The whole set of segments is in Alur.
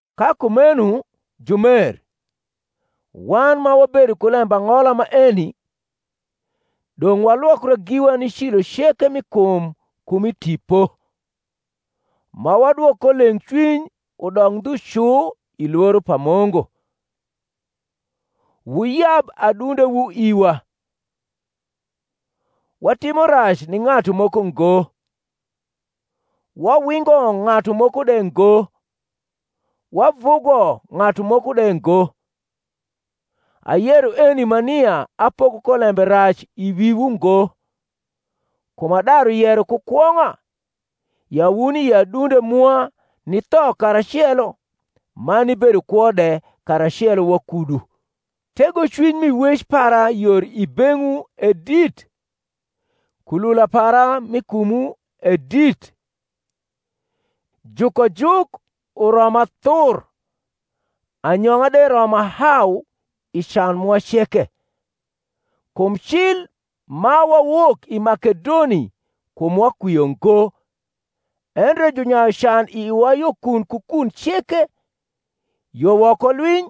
Ka kumeno, jumer, wan ma wabedo ku lembang’ola maeni, dong’ walwokra giwa ni cilo ceke mi kum ku mi tipo, ma wadwok ko leng’cwiny udok ndhu cu i lworo pa Mungu. Wuyab adundewu iwa: watimo rac ni ng’atu moko ngo, wawingo ng’atu moko de ngo, wavugo ng’atu moko de ngo. Ayero eni ma nia apoko ko lembe rac i wiwu ngo: kum adaru yero ku kwong’a, ya wuni i adunde mwa nitho karacelo man nibedo kwo de karacelo wakudu. Tegocwiny mi wec para yor i beng’wu e dit, kulula para m’i kumwu e dit: jukojuk uroma thur, anyong’a de roma hau i can mwa ceke. Kum cil ma wawok i Makedoni kumwa kwio ngo, endre junyayu can i iwa yo kun ku kun ceke; yo woko lwiny,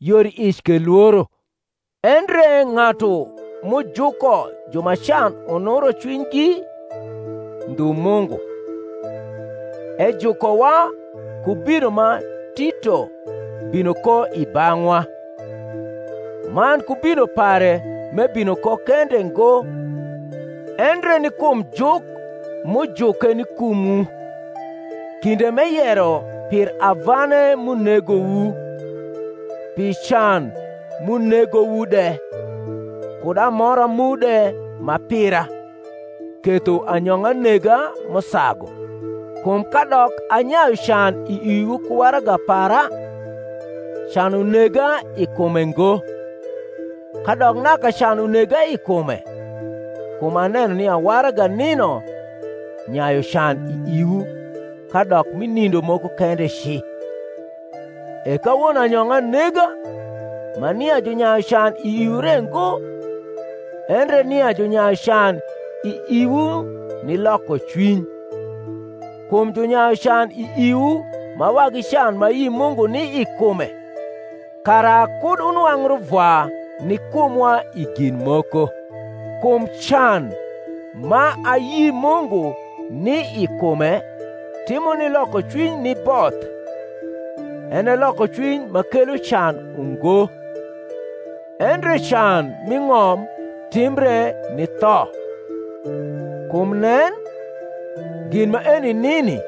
yor i ic ke lworo. Endre ng’atu m’ujuko ju ma can unuro cwinygi, ndliu Mungu, ejukowa ku bino ma Tito bino ko i bang’wa; man ku bino pare m’ebino ko kende ngo, endre ni kum juk m’ujuke ni kumwu, kinde m’eyero pir avane m’unegowu, pi can m’unegowu de, kud amora mu de ma pira; ketho anyong’a nega m’usagu. Kum kadok anyayu can i iwu ku waraga para, can unega i kume ngo: kadok naka can unega i kume (kum aneno nia waraga nino nyayu can i iwu, kadok mi nindo moko kende ci), e kawono anyong’a nega, ma nia junyayu can i iwu re ngo, endre nia junyayu can i iwu ni lokocwiny; kum junyayu can i iwu ma wagi can ma ayi Mungu ni i kume, kara kud wunwang’ ruvwa ni kumwa i gin moko. Kum can ma ayi Mungu ni i kume timo ni lokocwiny ni both, en e lokocwiny ma kelo can ungo: endre can m’i ng’om timbre ni tho. Kum nen, gin maeni nini,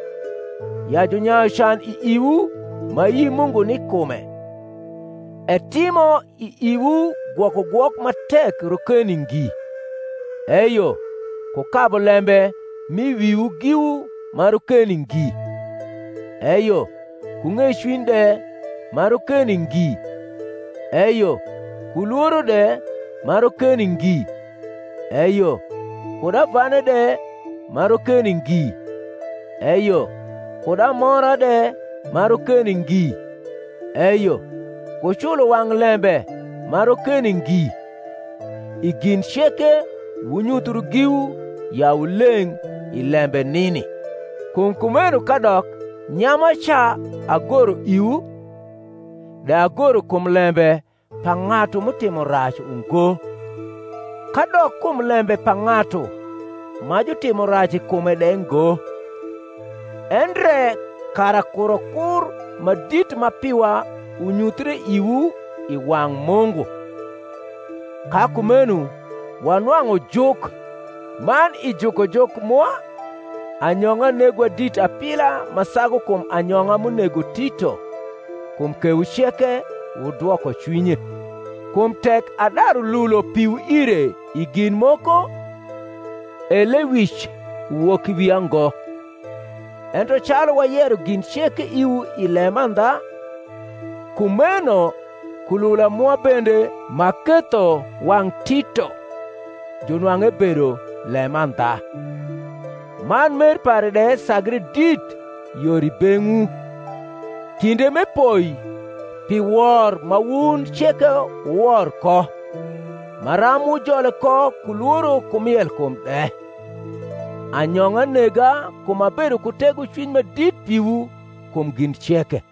ya junyayu can i iwu ma ayi Mungu ni i kume, etimo i iwu gwokogwok ma tek rokeni ngi, eyo ku kabu lembe m’i wiwu giwu ma rokeni ngi, eyo ku ng’ecwiny de ma rokeni ngi, eyo ku lworo de ma rokeni ngi, eyo kud avane de ma rokeni ngi, eyo kud amora de ma rokeni ngi, eyo ku culo wang’ lembe ma rokeni ngi! I gin ceke wunyuthru giwu ya wu leng’ i lembe nini. Kum kumeno kadok nyamaca agoro iwu, de agoro kum lembe pa ng’atu m’utimo rac ungo, kadok kum lembe pa ng’atu ma jutimo rac i kume de ngo, endre kara kurokur ma dit ma piwa unyuthie iwu i wang’ Mungu. Ka kumeno wanwang’u juk: man i jukojuk mwa anyong’a negowa dit apila ma sagu kum anyong’a m’unego Tito, kum kewu ceke wudwoko cwinye. Kum tek adaru lulo piwu ire i gin moko, e lewic uwok i wia ngo; ento calu wayero gin ceke iwu i lemandha, kumeno kulula mwa bende m’aketho wang’ Tito junwang’u ebedo lemandha. Man mer pare de sagre dit yor i beng’wu, kinde m’epoi pi wor ma wun ceke wuwor ko, maram wujole ko ku lworo ku mielkum de. Anyong’a nega kum abedo ku tegocwiny ma dit piwu kum gin ceke.